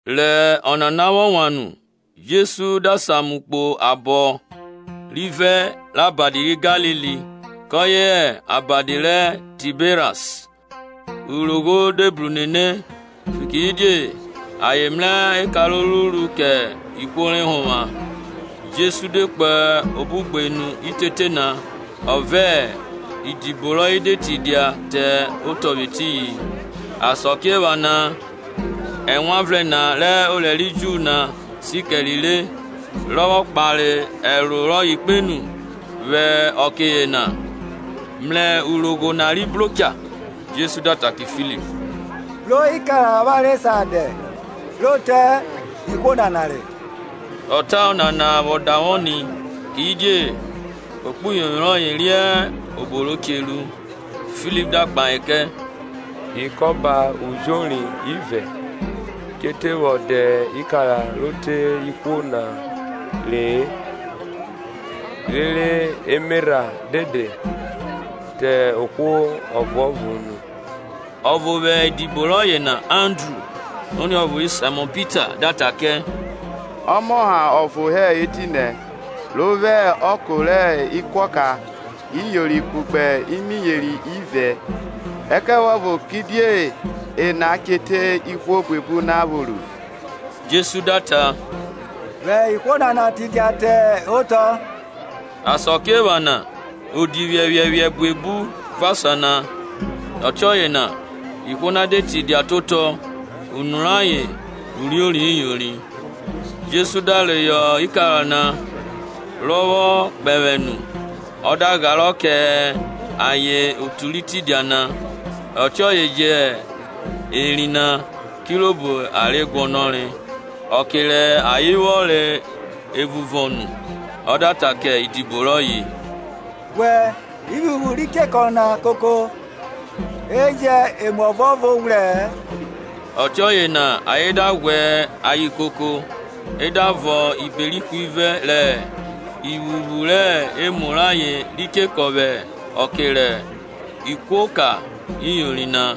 Rẹ ọnana vwọ wan nu Jesu da samu kpo abọ rivẹ rẹ Abadi ri Galili, kọye hẹ Abadi ri Taberas. Urogho de bru nene, fikiridie ayen mrẹ eka ro ruru kẹ ihwo re họnvwa. Jesu de yeri kpo obenu rẹ ugbenu na, ọ vẹ idibo rọye de tidia te otọ vwẹ etiyin. Asakiephana Ẹwanvrẹn na, rọ dia orẹ ri Ju na, si kẹre re. Rọ vwọ kpare ẹro rọye vwo ni, ọ da mrẹ urogho na ri bro cha, Jesu da ta kẹ Filip, Bro ikara avwanre sa dẹ, ro te ihwo nana re? Ọ ta ọnana vwọ davwọ ni, kidie ekpuyovwi rọye riẹn obọ ro che ruẹ. Filip da kpahe kẹ, Ikọba ujori ivẹ che te vwọ dẹ ikara ro te ihwo na re-e rẹ emerha de te ohwo ọvuọvo unu. Ọvo vwẹ idibo rọye na, Andru, oniọvo ri Saimọn Pita, da ta kẹ, Ọmọshare ọvo hẹ etinẹ ro vwo ọko rẹ ikara iyori kugbe imiyeri ivẹ; ẹkẹvuọvo kidie ena che te ihwo buebu na vwo ruẹ? Jesu da ta, Vwẹ ihwo na tidia tẹ otọ. Asakiephana odi phiẹphiẹphiẹ buebu vọn asan na; ọtiọye ihwo na de tidia te otọ, unu rayen uriori iyori. Jesu da reyọ ikara na, rọ vwọ kpẹvwẹ nu, ọ da gharọ kẹ ayen otu ri tidia na; ọtiọye je hẹ eri na, kirobo rẹ ayen guọnọre. Ọke rẹ ayen vwọ re evun vọn nu, ọ da ta kẹ idibọ roye, Ghwẹ ivwuvwu ri chekọ na koko, e jẹn emu ọvuọvo ghwrẹ-ẹ. Ọtiọye na ayen da ghwẹ ayen koko e da vọn ibere ihwivẹ rẹ ivwuvwu rẹ emu rẹ ayen re chekọ vwẹ ọko rẹ ekuoka iyọri na.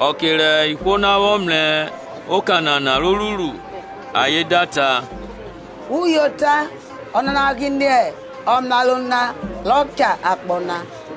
Ọke rẹ ihwo na vwọ mrẹ oka nana rọ ruru, ayen da ta, Uyota ọnana gbine ọmraro na rọ cha akpọ na.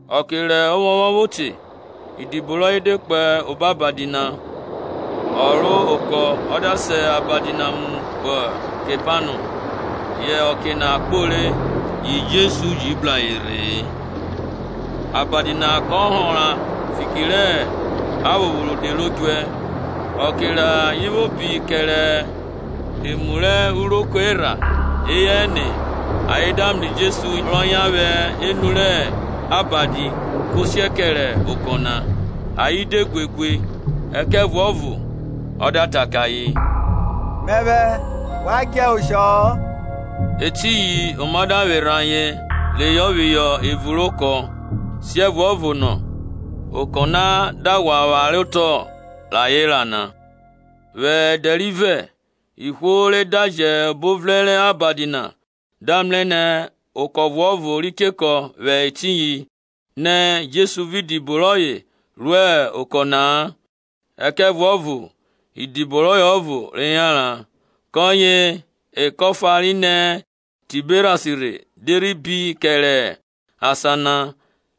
Ọke rẹ ovwọnvwọn vwo te, idibo rọye de kpo obo abadi na, Ayen ro okọ, ayen da sa abadi na mu kpo Kepanọm. Yẹ ọke na kpore, yi Jesu ji bru ayen rhe-e. Abadi na kọ họnra fiki rẹ aphopho rode ro djuẹ. Ọke rẹ ayen vwo bi kerẹ emu rẹ uroko erha eyẹ ẹne re, ayen da mrẹ Jesu rọ yan vwẹ enu rẹ abadi ko siẹ kẹrẹ okọ na. Ayen de guegue, ẹkẹvuọvo ọ da ta kẹ ayen, Mẹvwẹ; wa djẹ oshọ-ọ. Etiyin oma da vwerhe ayen reyọ phihọ evun rẹ okọ na, siẹvuọvo na okọ na da ghwa vware otọ vwẹ asa rẹ ayen ra na. Vwẹ ẹdẹ rivẹ ihwo re daji obo o vrẹn rẹ abadi na da mrẹ nẹ okọ ọvuọvo ri chekọ vwẹ etiyin, nẹ Jesu vẹ idibo rọye ro okọ na-a, ẹkẹvuọvo idibo rọye ọvo re yanran. Kọye, ekọ efa ri nẹ Taberas rhe de rhi bi kẹrẹ asan na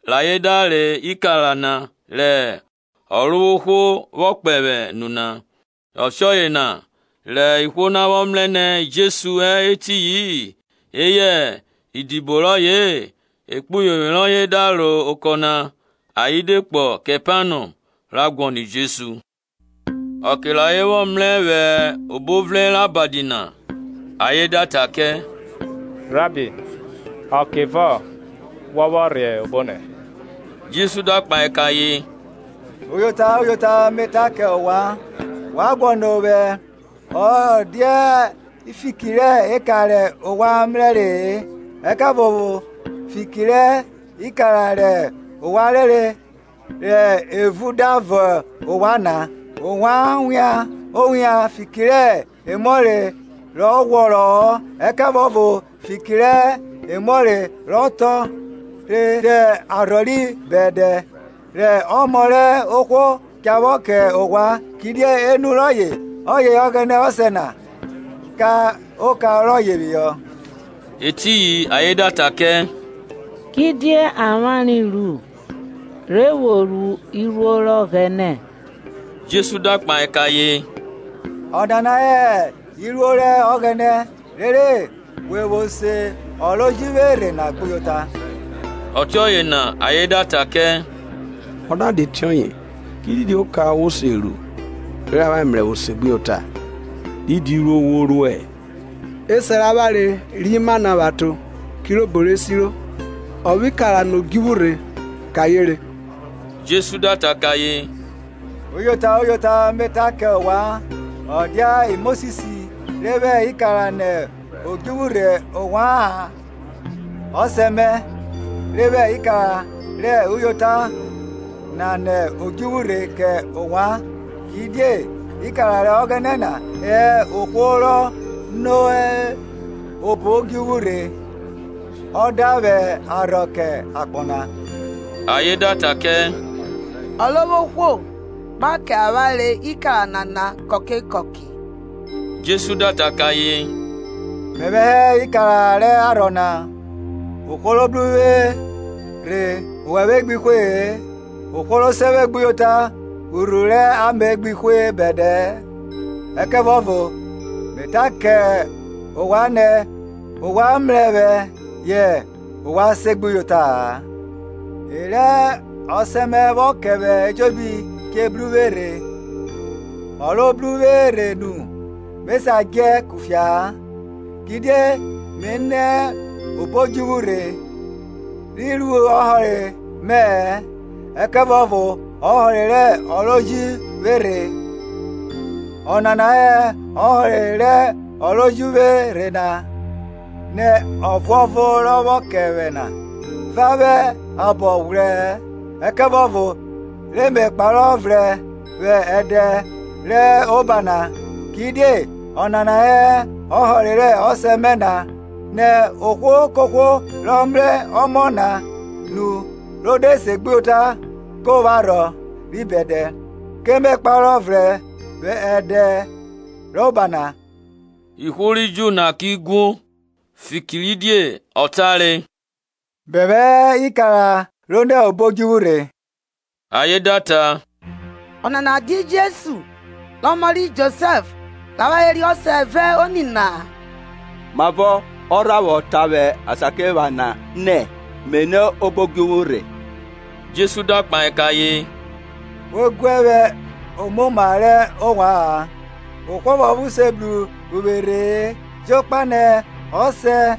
rẹ ayen da re ikara na rẹ Ọrovwohwo vwọ kpẹvwẹ nu na. Ọtiọye na rẹ ihwo na vwọ mrẹ nẹ Jesu hẹ etiyi-in, eyẹ idibo rọye-e, ekpuyovwi rẹ ayen da ro ekọ na ayen de kpo Kepanọm, ra guọnọ Jesu. Ọke rẹ ayen vwọ mrẹ vwẹ obo o vrẹn rẹ abadi na, ayen da ta kẹ, Rabbi, Ọkevọ wọ vwọ rhe obonẹ? Jesu da kpahe kẹ ayen, Uyota, uyota, me ta kẹ ovwan, wa guọnọ ovwẹ, ọ dia fiki rẹ eka rẹ ovwan mrẹre-e, ẹkẹvuọvo fiki rẹ ikara rẹ ovwan rere rẹ evun da vọn ovwan na. Ovwan wian owian fiki rẹ emuọre rọ ghwọrọ-ọ; ẹkẹvuọvo fiki rẹ emuọre rọ tọn re te arhọ ri bẹdẹ, rẹ Ọmọ rẹ ohwo cha vwọ kẹ ovwan; kidie enu rọye ọye Ọghẹnẹ Ọsẹ na ka oka rọye phihọ. Etiyin ayen da ta kẹ, Kidie avwanre ru, re vwo ru iruo rẹ Ọghẹnẹ? Jesu da kpahe kẹ ayen, Ọnana hẹ iruo rẹ Ọghẹnẹ, rere we vwo se ọ ro ji vwe rhe na gbuyota. Ọtiọye na ayen da ta kẹ, Ọ da dia ọtiọye ki didi oka wo se ru, rere avwanre mrẹ, vwo se we gbuyota? Didi iruo wo ruẹ? Esẹ rẹ avwanre re mana vwẹ aton; kirobo re siro, Ọ vwẹ ikara nẹ odjuvwn rhe kẹ ayen re. Jesu da ta kẹ ayen, Uyota, uyota, me ta kẹ ovwan, ọ dia Mosis re vwẹ ikara nẹ odjuvwu rhe ovwa-an; Ọsẹ mẹ re vwẹ ikara rẹ uyota na nẹ odjuvwu rhe kẹ ovwan. Kidie ikara rẹ Ọghẹnẹ na hẹ ohwo rọ nẹ obo odjuvwu rhe, ọ da vwẹ arhọ kẹ akpọ na. Ayen da ta kẹ, Ọrovwohwo, gba kẹ avwanre ikara nana kọke kọke. Jesu da ta kẹ ayen, Mẹvwẹ hẹ ikara rẹ arhọ na; ohwo ro bru uvwe rhe owẹvwe gbi hwe-e, ohwo ro se vwe gbuyota urhuru rẹ ame gbi hwe bẹdẹ-ẹ. Ẹkẹvuọvo me ta kẹ ovwan nẹ ovwan mrẹ vwẹ yẹ ovwan segbuyota-a. E rẹ Ọsẹ mẹ vwọ kẹ vwẹ ejobi che bru uvwe rhe, ọ ro bru uvwe rhe nu me sa djẹ kufia-a. Kidie mi nẹ obo odjuvwu rhe, rhi ru ọhọre mẹ-ẹ, ẹkẹvuọvo ọhọre rẹ ọ ro ji vwe rhe; ọnana hẹ ọhọre rẹ ọ ro ji vwe rhe na, nẹ ọvuọvo rọ vwọ kẹ vwẹ na va vwẹ abọ ghwrẹ-ẹ, ẹkẹvuọvo re me kparọ vrẹn vwẹ ẹdẹ rẹ oba na. Kidie ọnana hẹ ọhọre rẹ Ọsẹ mẹ na, nẹ ohwo kohwo rọ mrẹ Ọmọ na nu ro de segbuyota ko vwo arhọ ri bẹdẹ; ke me kparọ vrẹn vwẹ ẹdẹ rẹ oba na. Ihwo ri Ju na ki guo, fikiridie ọ tare, Mẹvwẹ hẹ ikara ro nẹ obo odjuvwu rhe. Ayen da ta, Ọnana dia Jesu, rẹ ọmọ ri Josẹf, rẹ avwanre riẹn ọsẹ vẹ oni rọye na? Mavọ ọ rha vwọ ta vwẹ asakiephana nẹ, Mi nẹ obo odjuvwu rhe? Jesu da kpahe kẹ ayen, We guẹ vwẹ omoma rẹ ovwa-an. Ohwo ọvuọvo se bru uvwe rhe-e jokpa nẹ Ọsẹ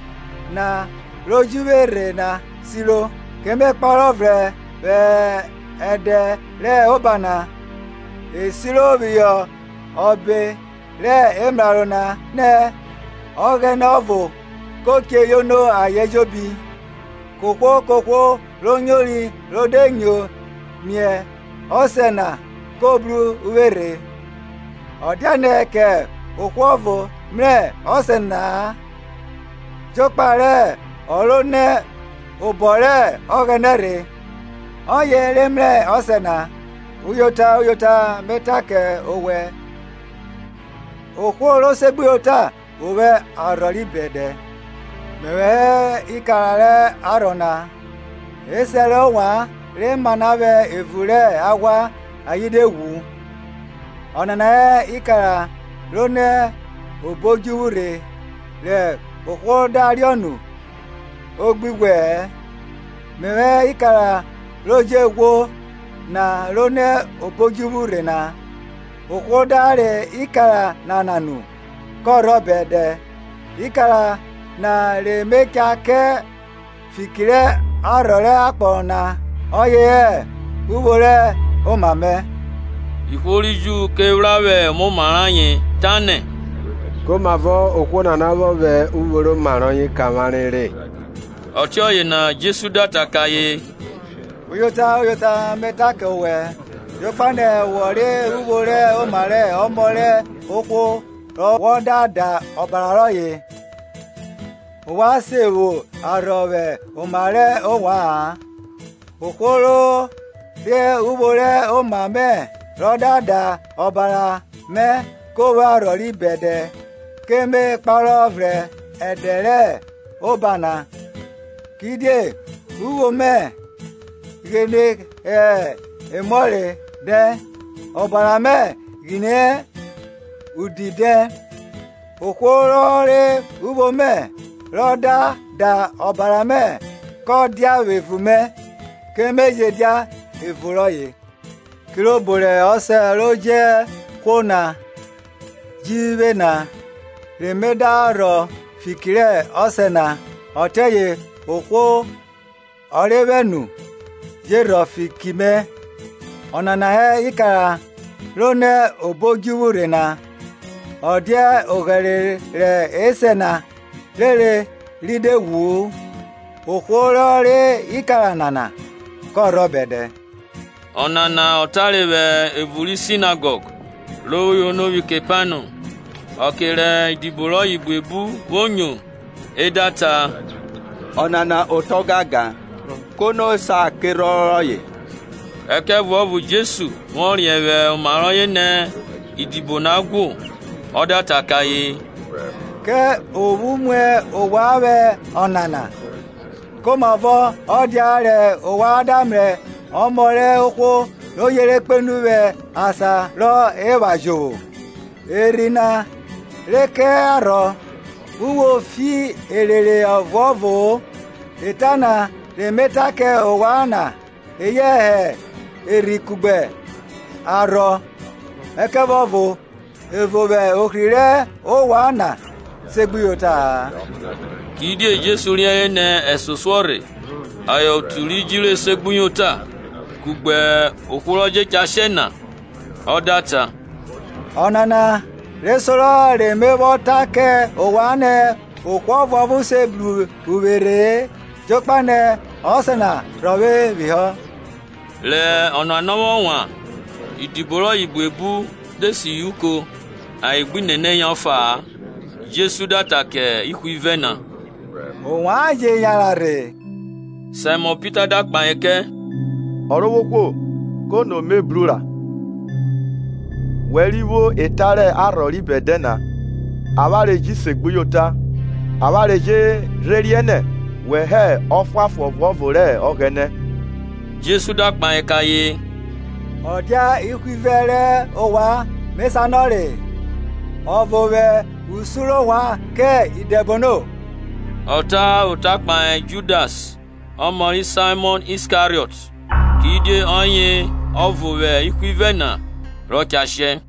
na ro ji vwe na siro toma; ke me kparọ vrẹn vwẹ ẹdẹ rẹ oba na. E siro phihọ ọbe rẹ emraro na nẹ, Ọghẹnẹ ọvo ko che yono ayen ejobi. Kohwo kohwo ro nyori ro de yono mie Ọsẹ na ko bru uvwe rhe. Ọ dianẹ kẹ ohwo ọvo mrẹ Ọsẹ na-a jokpa rẹ ọ ro nẹ obọ rẹ Ọghẹnẹ rhe; ọye re mrẹ Ọsẹ na. Uyota, uyota, me ta kẹ owẹ, ohwo ro segbuyota o vwo arhọ ri bẹdẹ. Mẹvwẹ hẹ ikara rẹ arhọ na. Esẹ rẹ ovwan re mana vwẹ evun rẹ aghwa, ayen de ghwu. Ọnana hẹ ikara ro nẹ obo odjuvwu rhe, rẹ ohwo da riọ nu o gbi ghwẹ-ẹ. Mẹvwẹ hẹ Ikara ro je ghwo na ro nẹ obo odjuvwu rhe na; ohwo da re ikara nana nu, kọ rhọ bẹdẹ; ikara na re me cha kẹ fiki rẹ arhọ rẹ akpọ na ọye hẹ uvwo rẹ oma mẹ. Ihwo ri Ju ke phra vwẹ omoma rẹ ayen, tanẹ, Komavo ohwo nana vwọ vwẹ uvwo rẹ oma rọye kẹ avwanre re? Ọtiọye na Jesu da ta kẹ ayen, Uyota, uyota, me ta kẹ owẹ, jokpa nẹ wọ re uvwo rẹ oma rẹ Ọmọ rẹ ohwo re wọ da da obara rọye-e, ovwan se vwo arhọ vwẹ oma rẹ ovwa-an; ohwo ro re uvwo rẹ oma mẹ rọ da da ọbara mẹ ko vwo arhọ ri bẹdẹ, ke me kparọ vrẹn vwẹ ẹdẹ rẹ oba na. Kidie uvwo mẹ ghine hẹ emuọre dẹn, ọbara mẹ gbine hẹ udi dẹn. Ohwo rọ re uvwo mẹ rọ da da ọbara mẹ kọ dia vwẹ evun mẹ, ke me je dia evun rọye. Kirobo rẹ Ọsẹ ro je ghwo na ju vwe na, re me da rhọ fiki rẹ Ọsẹ na, ọtiọye ohwo rọ re vwe nu je rhọ fiki mẹ. Ọnana hẹ ikara ro nẹ obo odjuvwu rhe na, ọ dia oghẹre rẹ esẹ na rere ri de ghwu-u; ohwo rọ re ikara nana kọ rhọ bẹdẹ. Ọnana ọ tare vwẹ evun ri sinegọg, ro vwo yono vwi Kepanọm. Ọke rẹ idibo rọye buebu, vwo nyo, e da ta, Ọnana ota ọgangan; kono sa kerhọn rọye? Ẹkẹvuọvo Jesu, vwọ riẹn vwẹ oma rọye nẹ idibo na guo, ọ da ta kẹ ayen, Ke ophu muẹ ovwan vwẹ ọnana? Komavọ ọ dia rẹ ovwan da mrẹ Ọmọ rẹ ohwo ro yere kpenu vwẹ asan rọ epha jovwo? Erhi na re kẹ arhọ, uvwo fi erere ọvuọvoo; eta na re me ta kẹ ovwan na eye hẹ erhi kugbe arhọ. Ẹkẹvuọvo evo vwẹ ohri rẹ ovwan na segbuyota-a. Kidie Jesu riẹnre nẹ ẹsosuọ rhe ayen otu ri jiro esegbuyota, kugbe ohwo rọ je cha shẹ na. Ọ da ta, Ọnana re sorọ re me vwọ ta kẹ ovwan nẹ ohwo ọvuọvo se bru uvwe rhe-e jokpa nẹ Ọsẹ na rhọvwe phihọ. Rẹ ọnana vwọ wan nu idibo rọye buebu de sihọ uko ayen gbi nene yan ọfa-a. Jesu da ta kẹ ihwivẹ na, Ovwan je yanran rhe? Saimọn Pita da kpahe kẹ, Ọrovwohwo, kono mi bru ra? Wẹ ri vwo eta rẹ arhọ ri bẹdẹ na; avwanre ji segbuyota, avwanre je rhe riẹn nẹ, wẹ hẹ Ọfuanfon Ọvuọvo rẹ Ọghẹnẹ. Jesu da kpahe kẹ ayen, Ọ dia ihwivẹ rẹ ovwan me sanọre-e, ọvo vwẹ usun rẹ ovwan na kẹ idẹbono? Ọ ta ota kpahe Judas ọmọ ri Saimọn Iskariọt, kidie ọye, ọvo vwẹ ihwivẹ na, rọ cha shẹ.